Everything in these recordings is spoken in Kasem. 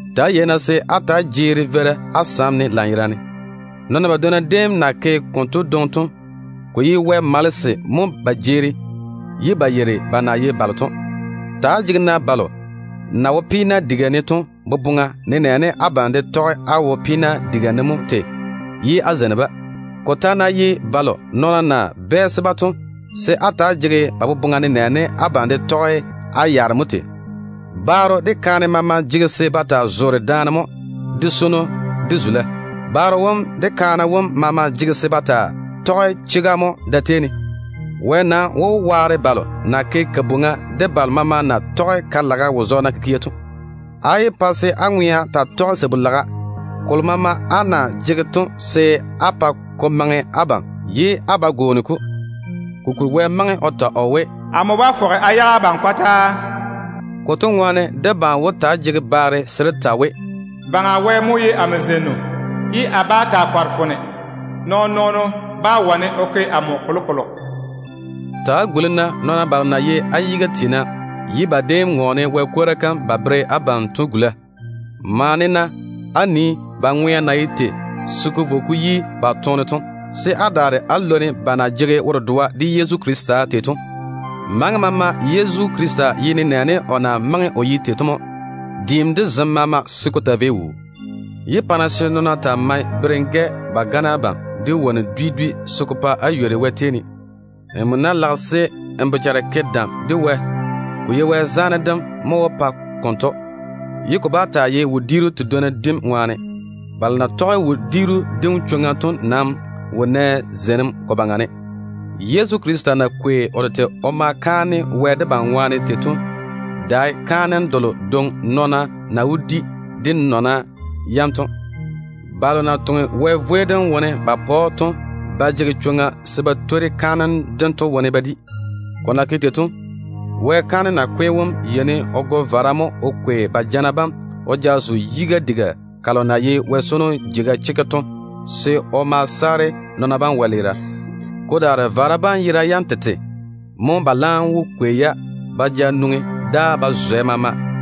Ta‑á yei-na se á ta‑á jeeri veira á sam ne lanyerane. Nɔɔna badwonna déem na ke konto dwoŋi to, ko ye Wɛ malese mo ba jeeri ye ba yeiri ba na ye balo to. Ta‑á jege-na balo na wo peena diga ne to boboŋa, nenɛɛne abam de tɔge á wo peena diga ne mo tei, ye á zeini-ba. Ko ta ná ye balo nɔɔna na bɛɛse-ba to, se á ta‑á jege ba boboŋa nenɛɛne abam de tɔge á yaare mo tei. Baaro de kaane maama jege se ba taa zoore daane mo de swono de zula. Baro wom de kaane wom maama jege se ba taa tɔge chega mo da-tei ne. Wɛ nam wó waare balo na ke kabwoŋa, de balo maama na tɔge ka-laga wo-zɔɔna kikia to. Á yé pa se á ŋwea taa tɔge sabu-laga. Kolo maama á na jege to, se á pa ko maŋe abam ye á ba gwooni-ko. Kokuri Wɛ maŋe o ta o we, “Amo bá fɔge a yage abam kɔtaa.” Konto ŋwaane debam wó taa jege baare se dé ta we: “Baŋa Wɛ mo ye amo zeinnu. A daa bá taa kɔre foone. Nabiina lage ba ke amo bɛ mo?” Ta‑á guli-na nɔɔna balo na ye á yiga tiina ye ba déem ŋɔɔne Wɛ kwora kam ba bere abam to gula. Maane-na á nii ba ŋwea na ye tei se ko vo ko yi ba toone to, se á daare á lwoni ba na jege wo-dedoa de Yezu Krista tei to. Maŋa maama Yezu Krista ye nenɛɛne o na maŋe o ye tei to mo, diim de zem maama, se ko taa vei wuu. Yé pa-na se nɔɔna taa mae berem-gɛ ba gane abam de wonnu dwi dwi se ko pa á ywori Wɛ tei ne. Nmo ná lage se n bochare ke dam de Wɛ, ko ye Wɛ zaane dem mo wó pa konto, ye ko bá taa ye wodiiru tedwonna dim ŋwaane. Balo na tɔge wodiiru dim chwoŋa to nam wo nɛ nyɔɔre ko baŋa ne. Yezu Krista na kwei o tete o ma kaane Wɛ debam ŋwaane tei to dae kaanem delo dwoŋi nɔɔna na wó di de nɔna yam to. Balo na toŋe Wɛ vwei dem wone ba pa‑o to ba jege chwoŋa se ba twori kaanem dento wone ba di. Ko na ke tei to, Wɛ kaanem nakwe tu wom yeini o go vara mo o kwei ba jana bam o ja zo Wɛ di-yun-gala kam se o ma saare nɔɔna bam wɛleera. Ko daare vara bam yera yam tete mo, ba laam wó kwei-ya ba ja nwoŋi dáa ba zwɛ maama.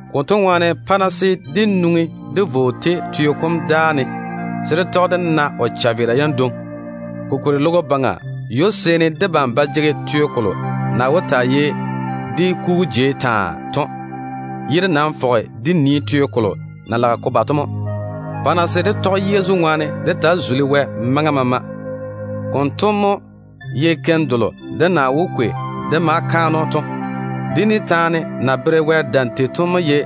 Konto ŋwaane, pa-na se dé nwoŋi dé vo o tei teo kom dáa ne, se dé tɔge dé na o chaveera yam dwoŋi. Kokuri logo baŋa ywo-seeni debam ba jege teo kolo na wó taa ye dé kugu jei taa to, ye dé nam jege teena se dé na teo kolo na lage ko ba to mo. Pa-na se dé tɔge Yezu ŋwaane dé taa zuli Wɛ maŋa maama. Konto mo ye keim delo dé na wó kwei dé ma ke kaanem dé pa‑o to. Dé ni taane na zeiŋi Wɛ yere tei to mo ye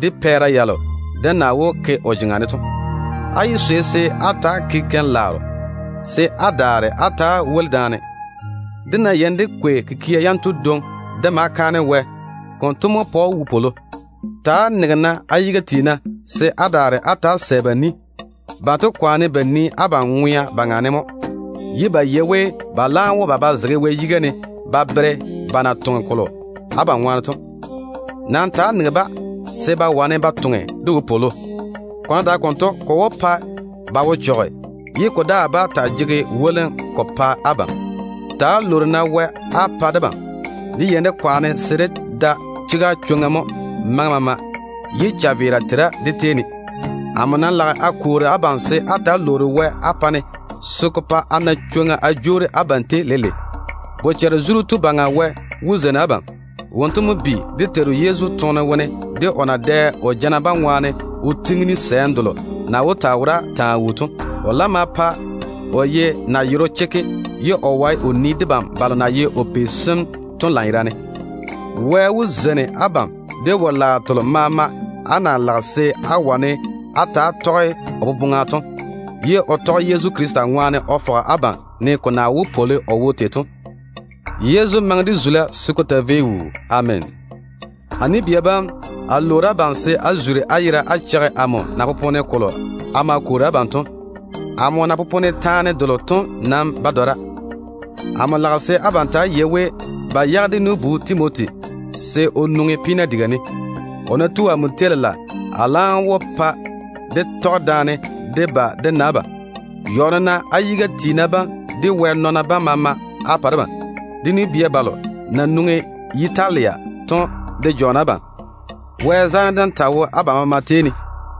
dé pɛɛra yalo dé na wó ke o jeŋa ne to. Á yé swei se á ta‑á ke keim-laaro, se á daare á ta‑á woli daane. Dé ná yeini dé kwei kikia yanto dwoŋi dé ma kaane Wɛ, konto mo pa‑o wopwolo. Ta‑á nege-na á yiga tiina, se á daare á ta‑á sɛ ba ni. Banto kwaane ba nii abam ŋwea baŋa ne mo, ye ba yei we ba laam wó ba ba zege Wɛ yiga se o bwei-ba ba totoŋa yam ŋwaane. Nam ta‑á nege-ba se ba wane ba toŋe de wopwolo. Ko ná dae konto, ko wó pa ba wo chɔge, ye ko daa bá taa jege wolim ko pa abam. Ta‑á lwoori-na Wɛ á pa debam. Dé yeini dé kwaane se dé da chega chwoŋa mo maŋa maama, ye chaveera tera dé tei ne. Amo nam lage a kwoori abam se á ta‑á lwoori Wɛ á pa-ne, se ko pa a na chwoŋa a jwoori abam tei leile. Bochare-zuru Tu Baŋa Wɛ wó zeini abam. Wonto mo bi de Teiru Yezu toone wone de o na dɛ o jana bam ŋwaane o gwoni ni delo na wó taa wora taa wuu to. O laam ma pa o ye nayero chekke ye o wae o nii debam balo na nye de o pei sem to lanyerane. Wɛ wó zeini abam de wo-laaro telo maama na maŋe se á wane á ta‑á tɔge o boboŋa to, ye o tɔge Yezu Krista ŋwaane o fɔge abam, ne ko na wó pwoli o wo tei to. Yezu maŋe de zula se ko taa vei wuu. Ameena. A nu-bia bam, a lwoori abam se á zuri á yera á cheigi amo na popone kolo a ma kwoori abam to. Amo na popone taane delo to nam ba dɔra. A lage se abam ta‑á yei we, ba yage dé nu-bu Timoti se o nwoŋi peena diga ne. O ná tu amo tei lela, a laam wó pa dé tɔge daane dé ba dé na abam. Jɔɔne-na á yiga tiina bam, de Wɛ nɔɔna bam maama á pa debam. Dé nu-bia balo na nwoŋi Yitalia to de jɔɔne abam. Wɛ zaane dem taa wo abam maama tei ne.